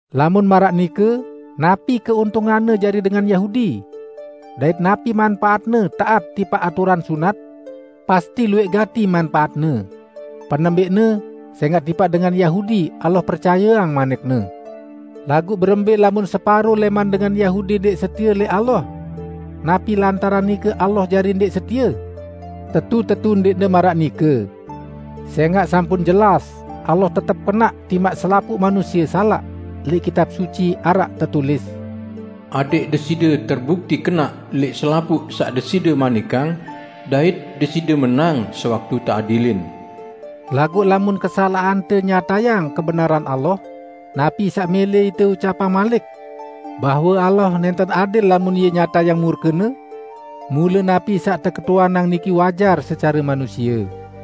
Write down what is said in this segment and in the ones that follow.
Lamun maraq nike napi keuntunganne jari dengan Yahudi? Dait napi manpaatne taat tipaq aturan sunat? Pasti luwẽq gati manpaatne! Penembẽqne, sẽngaq tipaq dengan Yahudi Allah percayeang manik-Ne. Laguq berembẽ lamun separo lẽman dengan Yahudi ndẽq setie lẽq Allah? Napi lantaran nike Allah jari ndẽq setie? Tetu-tetu ndẽqne maraq nike! Sẽngaq sampun jelas Allah tetep kenaq timaq selapuq manusie salaq, lẽq Kitab Suci araq tetulis, "Adẽq Deside terbukti kenaq lẽq selapuq saq Deside manikang, dait Deside menang sewaktu teadilin." Laguq lamun kesalaqante nyatayang kebenaran Allah, napi saq mẽlẽ ite ucapang malik? Bahwe Allah nẽnten adil lamun Ie nyatayang murke-Ne? (Mule napi saq teketuanang niki wajar secare manusie.)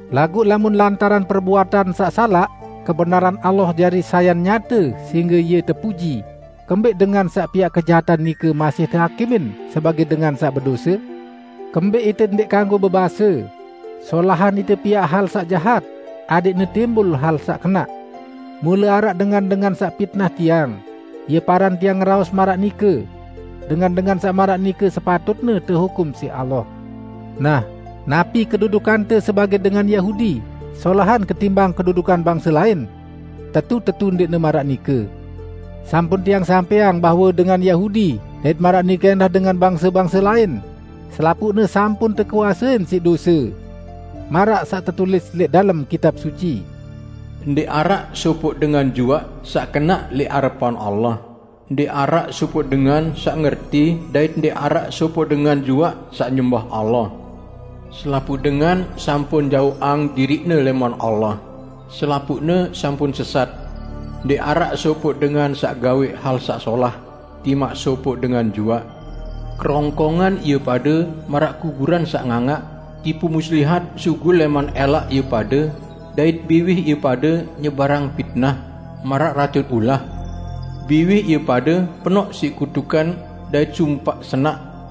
Laguq lamun lantaran perbuatan saq salaq, kebenaran Allah jari sayan nyate sehingge Ie tepuji, kembẽq dengan saq piaq kejahatan nike masih tehakimin sebagẽ dengan saq bedose? Kembẽq ite ndẽq kanggo bebase, "Solahan ite piaq hal saq jahat, adẽqne timbul hal saq kenaq." Mule araq dengan-dengan saq pitnah tiang, ie paran tiang ngeraos maraq nike. Dengan-dengan saq maraq nike sepatutne tehukum siq Allah. Nah, napi kedudukante sebagẽ dengan Yahudi solahan ketimbang kedudukan bangse lain? Tetu-tetu ndẽqne maraq nike! Sampun tiang sampẽang bahwe dengan Yahudi dait maraq nike ẽndah dengan bangse-bangse lain, selapuqne sampun tekuasein siq dose. Maraq saq tetulis lẽq dalem Kitab Suci, "Ndẽq araq sopoq dengan juaq saq kenaq lẽq arepan Allah, ndẽq araq sopoq dengan saq ngerti dait ndẽq araq sopoq dengan juaq saq nyembah Allah. Selapuq dengan sampun jaoqang diriqne lẽman Allah; selapuqne sampun sesat. Ndẽq araq sopoq dengan saq gawẽq hal saq solah, timaq sopoq dengan juaq! Kerongkongan ie pade maraq kuburan saq ngangaq, tipu muslihat sugul lẽman ẽlaq ie pade dait biwih ie pade nyebarang pitnah, maraq racun ulah. Biwih ie pade penoq siq kutukan dait sumpaq senaq.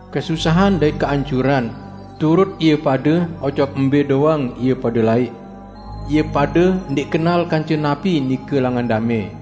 Kesusahan dait keancuran, turut ie pade ojok mbẽ doang ie pade laiq. Ie pade ndẽq kenal kance napi nike langan damẽ,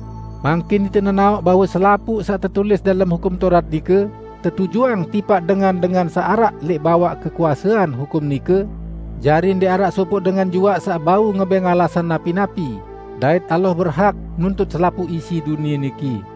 Mangkin ite nenaoq bahwe selapuq saq tetulis dalem Hukum Taurat nike tetujuang tipaq dengan-dengan saq araq lẽq bawaq kekuasean hukum nike, jari ndẽq araq sopoq dengan juaq saq bau ngebẽng alasan napi-napi, dait Allah berhak nuntut selapuq isi dunie niki.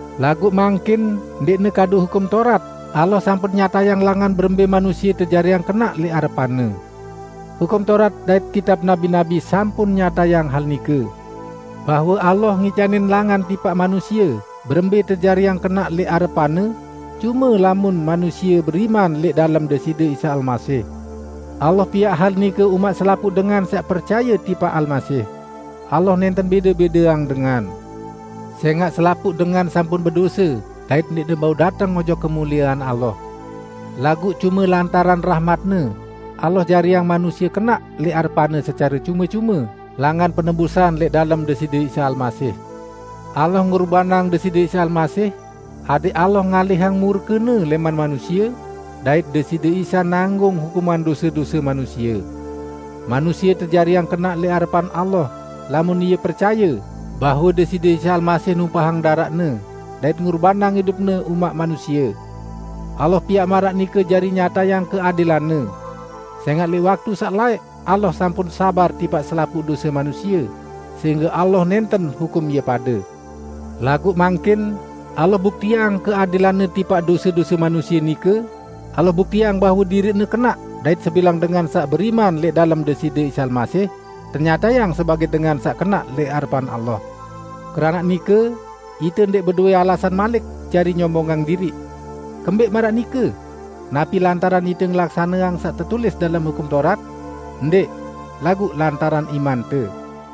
Laguq mangkin ndẽqne kadu Hukum Taurat, Allah sampun nyatayang langan berembẽ manusie tejariang kenaq lẽq arepan-Ne. Hukum Taurat dait kitab nabi-nabi sampun nyatayang hal nike, bahwe Allah ngicanin langan tipaq manusie berembẽ tejariang kenaq lẽq arepan-Ne, cume lamun manusie beriman lẽq dalem Deside Isa Almasih. Allah piaq hal nike umaq selapuq dengan saq percaye tipaq Almasih. Allah nẽnten bẽde-bẽdeang dengan. Sẽngaq selapuq dengan sampun bedose dait ndẽqne bau dateng ojok kemuliean Allah. Laguq cume lantaran rahmat-Ne, Allah jariang manusie kenaq lẽq arepan-Ne secare cume-cume langan penebusan lẽq dalem Deside Isa Almasih. Allah ngurbanang Deside Isa Almasih, adẽq Allah ngalihang murke-Ne lẽman manusie, dait Deside Isa nanggung hukuman dose-dose manusie. Manusie tejariang kenaq lẽq arepan Allah lamun ie percaye bahwe Deside Isa Almasih numpahang daraq-Ne dait ngurbanang idup-Ne umaq manusie. Allah piaq maraq nike jari nyatayang keadilan-Ne. Sẽngaq lẽq waktu saq laẽq Allah sampun sabar tipaq selapuq dose manusie, sehingge Allah nẽnten hukum ie pade. Laguq mangkin, Allah buktiang keadilan-Ne tipaq dose-dose manusie nike, Allah buktiang bahwe diriq-Ne kenaq dait sebilang dengan saq beriman lẽq dalem Deside Isa Almasih tenyatayang sebagẽ dengan saq kenaq lẽq arepan Allah. Keranaq nike, ite ndẽq bedowẽ alasan malik jari nyombongang diriq. Kembẽq maraq nike? Napi lantaran ite ngelaksaneang saq tetulis dalem Hukum Taurat? Ndẽq! Laguq lantaran imante.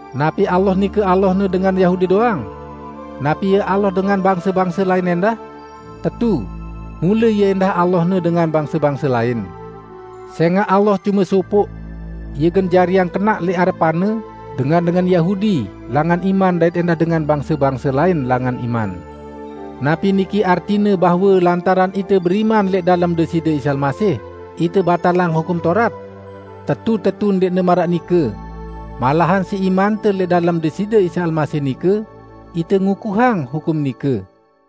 Napi Allah nike Allahne dengan Yahudi doang? Napi Ie Allah dengan bangse-bangse lain ẽndah? Tetu. Mule Ie ẽndah Allahne dengan bangse-bangse lain! Sẽngaq Allah cume sopoq. Ie gen jariang kenaq lẽq arepan-Ne, dengan-dengan Yahudi langan iman dait ẽndah dengan bangse-bangse lain langan iman. Napi niki artine bahwe lantaran ite beriman lẽq dalem Deside Isa Almasih, ite batalang Hukum Taurat? Tetu-tetu ndẽqne maraq nike! Malahan siq imante lẽq dalem Deside Isa Almasih nike, ite ngukuhang hukum nike.